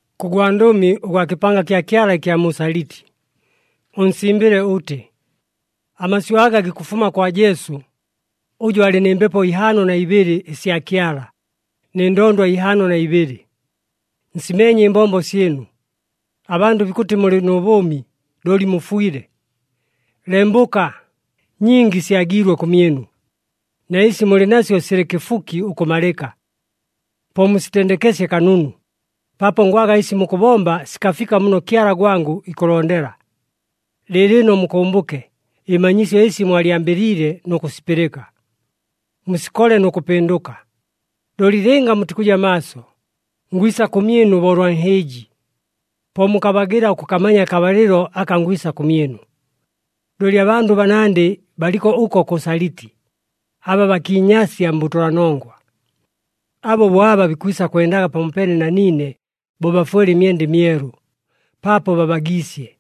“Kʉ gwandʉmi ʉgwa kɨpanga kya Kyala ɨkya mu Saliti, ʉnsimbɨle ʉtɨ: Amasyʉ aga gikʉfuma kwa Jesu, ʉjʉ alɨ nɨ Mbepo ihaano na ibɨlɨ ɨsya Kyala, nɨ ndondwa ihaano na ibɨlɨ: Nsimeenye ɨmbombo syɨnu. Abandʉ bikʉtɨ mulɨ nʉ bʉʉmi, looli mufwile. Lembʉka! Nyingi syagiilwe kʉmyɨnu, na ɨsi mulɨ nasyo silɨ kɨfuki ʉkʉmalɨka! Po musitendekesye kanunu, paapo ngwaga ɨsi mukʉbomba sikafika muno Kyala gwangʉ ikʉlondela. Lɨɨlɨno mukʉmbʉke ɨmanyisyo ɨsi mwalyambɨliile nʉ kʉsipɨlɨka. Musikole nʉ kʉpɨndʉka. Looli lɨnga mutikʉja maaso, ngwisa kʉmyɨnu bo ʉlwa nhɨɨji. Po mukabagɨla ʉkʉkamanya akabalɨlo aka ngwisa kʉmyɨnu. Looli abandʉ banandɨ baliko ʉko kʉ Saliti, aba bakiinyasya mbʉtʉlanongwa. Abo bo aba bikwisa kwendaga pamopeene na niine bo bafwele ɨmyenda ɨmyelu, paapo babagiisye.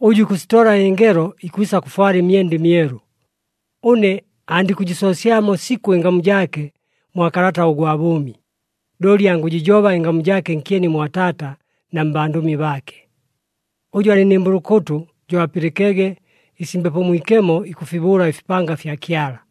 Ʉjʉ ikʉsitola ɨngelo, ikwisa kʉfwala ɨmyenda ɨmyelu. Ʉne andikʉjɨsoosyamo sikʉ ɨngamu jaake mwa kalata ʉgwa bʉʉmi, looli angʉjɨjoba ɨngamu jaake nkyeni mwa Taata na mbandʉmi baake. Ʉjʉ alɨ nɨ mbʉlʉkʉtʉ, jo apɨlɨkege ɨsi Mbepo Mwikemo ikʉfibʉʉla ɨfipanga fya Kyala.”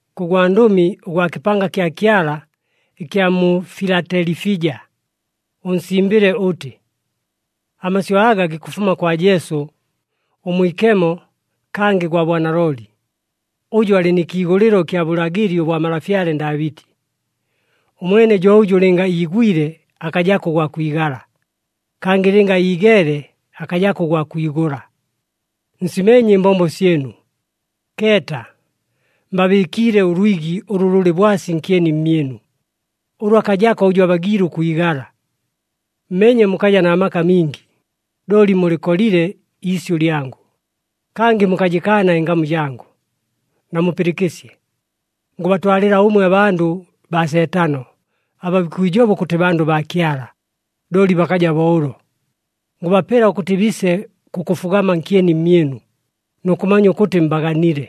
“Kʉ gwandʉmi ʉgwa kɨpanga kya Kyala ɨkya mu Filatelifija, ʉnsimbɨle ʉtɨ: Amasyʉ aga gikʉfuma kwa Jesu, ʉMwikemo, kangɨ gwa bwanalooli, ʉjʉ alɨ nɨ kiigʉlɨlo ɨkya bʉlagɨli ʉbwa malafyale Ndaabɨti. Ʉmwene jo ʉjʉ lɨnga iigwile akajako ʉgwa kwigala, kangɨ lɨnga iigeele akajako ʉgwa kwigʉla. Nsimeenye ɨmbombo syɨnu. Keeta, mbabɨɨkiile ʉlwigi ʉlʉ lʉlɨ bwasi nkyeni mmyɨnu, ʉlʉ akajako ʉjʉ abagiile ʉkwigala. Mmeenye mukaja na maka mingi, looli mulɨkolile iisyʉ lyangʉ, kangɨ mukajɨkaana ɨngamu jangʉ. Namupɨlɨkɨsye! Ngʉbatwalɨla ʉmwe abandʉ baa Seetano, aba bikwijoba ʉkʉtɨ bandʉ baa Kyala, looli bakaja bo ʉlo. Ngʉbapela ʉkʉtɨ biise kʉkʉfugama nkyeni mmyɨnu, nʉ kʉmanya ʉkʉtɨ mbaganile.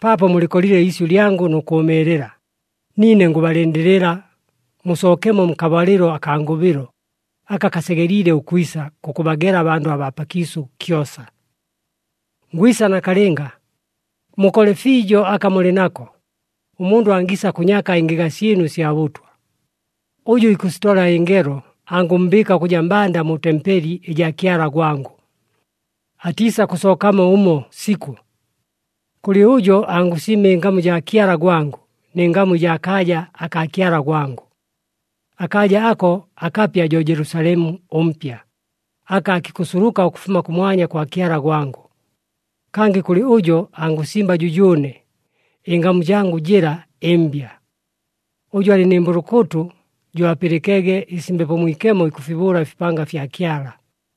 Paapo mulɨkolile iisyʉ lyangʉ nʉ kʉʉmɨɨlɨla, niine ngʉbalɨndɨlɨla, musookemo nkabalɨlo akaa ngʉbɨlo, aka kasegeliile ʉkwisa kʉkʉbagela abandʉ abaa pakiisʉ kyosa. Ngwisa nakalɨnga. Mukole fiijo aka mulɨ nako, ʉmundʉ angiisa kʉnyaka ɨngɨga syɨnu ɨsya bʉtwa. Ʉjʉ ikʉsitola ɨngelo, angʉmmbɨɨka ʉkʉja mbanda mu tempeli ɨjaa Kyala gwangʉ. Atiisakʉsookamo ʉmo sikʉ. Kʉlɨ ʉjo, angʉsimba ɨngamu jaa Kyala gwangʉ, nɨ ngamu ɨjaa kaaja akaa Kyala gwangʉ. Akaaja ako akapya jo Jelusalemu ʉMpya, aka aakikʉsuluka ʉkʉfuma kʉmwanya kwa Kyala gwangʉ. Kangɨ kʉlɨ ʉjo angʉsimba jʉjʉʉne, ɨngamu jangʉ jɨla ɨmbya. Ʉjʉ alɨ nɨ mbʉlʉkʉtʉ, jo apɨlɨkege ɨsi Mbepo Mwikemo ikʉfibʉʉla ɨfipanga fya Kyala.”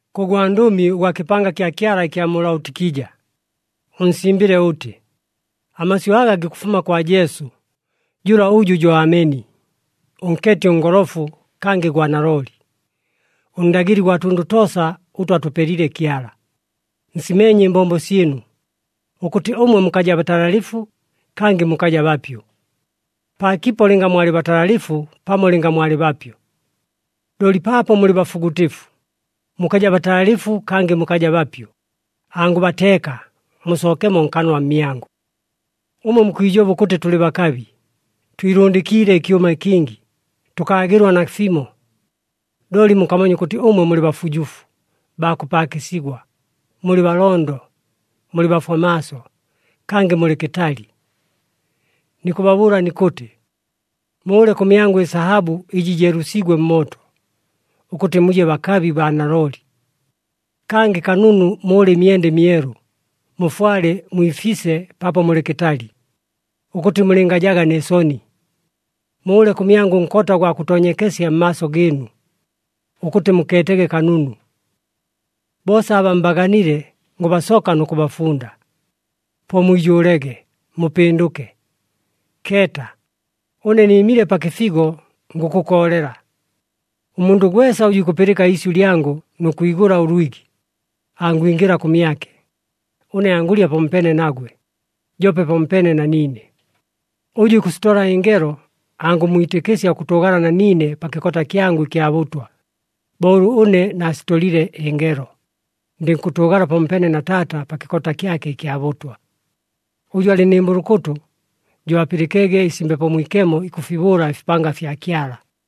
“Kʉ gwandʉmi ʉgwa kɨpanga kya Kyala ɨkya mu Laotikija, ʉnsimbɨle ʉtɨ: Amasyʉ aga gikʉfuma kwa Jesu, jʉla ʉjʉ jo Ameni, ʉnkeeti ʉngolofu kangɨ gwa nalooli, ʉNdagɨli gwa tʉndʉ toosa ʉtʉ atʉpelile Kyala: Nsimeenye ɨmbombo syɨnu, ʉkʉtɨ ʉmwe mukaja batalalɨfu, kangɨ mukaja bapyʉ. Paakipo lɨnga mwalɨ batalalɨfu pamo lɨnga mwalɨ bapyʉ! Looli paapo mulɨ bafugʉtɨfu, mukaja batalalɨfu kangɨ mukaja bapyʉ, angʉbateeka, musookemo nkanwa mmyangʉ. Ʉmwe mukwijoba ʉkʉtɨ, ‘Tʉlɨ bakabi, twilʉndɨkiile ɨkyʉma kingi, tʉkaagɨlwa nafimo.’ Looli mukamanya ʉkʉtɨ ʉmwe mulɨ bafujufu, baa kʉpaakɨsigwa, mulɨ balondo, mulɨ bafwa maaso, kangɨ mulɨ kɨtali. Nikʉbabʉʉla nikʉtɨ, mʉʉle kʉmyangʉ ɨsahabʉ ɨjɨ jeelʉsiigwe mmooto, ʉkʉtɨ muje bakabi baa nalooli. Kangɨ kanunu mʉʉle ɨmyenda ɨmyelu, mufwale, mwifise paapo mulɨ kɨtali, ʉkʉtɨ mulɨngajaga nɨ soni. Mʉʉle kʉmyangʉ ʉnkota ʉgwa kʉtoonyekesya mmaaso gɨɨnu, ʉkʉtɨ mukeetege kanunu. Boosa aba mbaganile, ngʉbasoka nʉ kʉbafunda. Po mwijʉʉlege, mupɨndʉke. Keeta, ʉne nɨɨmile pa kɨfigo, ngʉkʉkoolela. Ʉmundʉ gwesa ʉjʉ ikʉpɨlɨka iisyʉ lyangʉ nʉ kwigʉla ʉlwigi, angwingɨla kʉmyake, ʉne angʉlya pamopeene nagwe, joope pamopeene na niine. Ʉjʉ ikʉsitola ɨngelo, angʉmmwitɨkɨsya ʉkʉtʉʉgala na niine pa kɨkota kyangʉ ɨkya bʉtwa, bo ʉlʉ ʉne naasitolile ɨngelo, ndɨnkʉtʉʉgala pamopeene na Taata pa kɨkota kyake ɨkya bʉtwa. Ʉjʉ alɨ nɨ mbʉlʉkʉtʉ, jo apɨlɨkege ɨsi Mbepo Mwikemo ikʉfibʉʉla ɨfipanga fya Kyala.”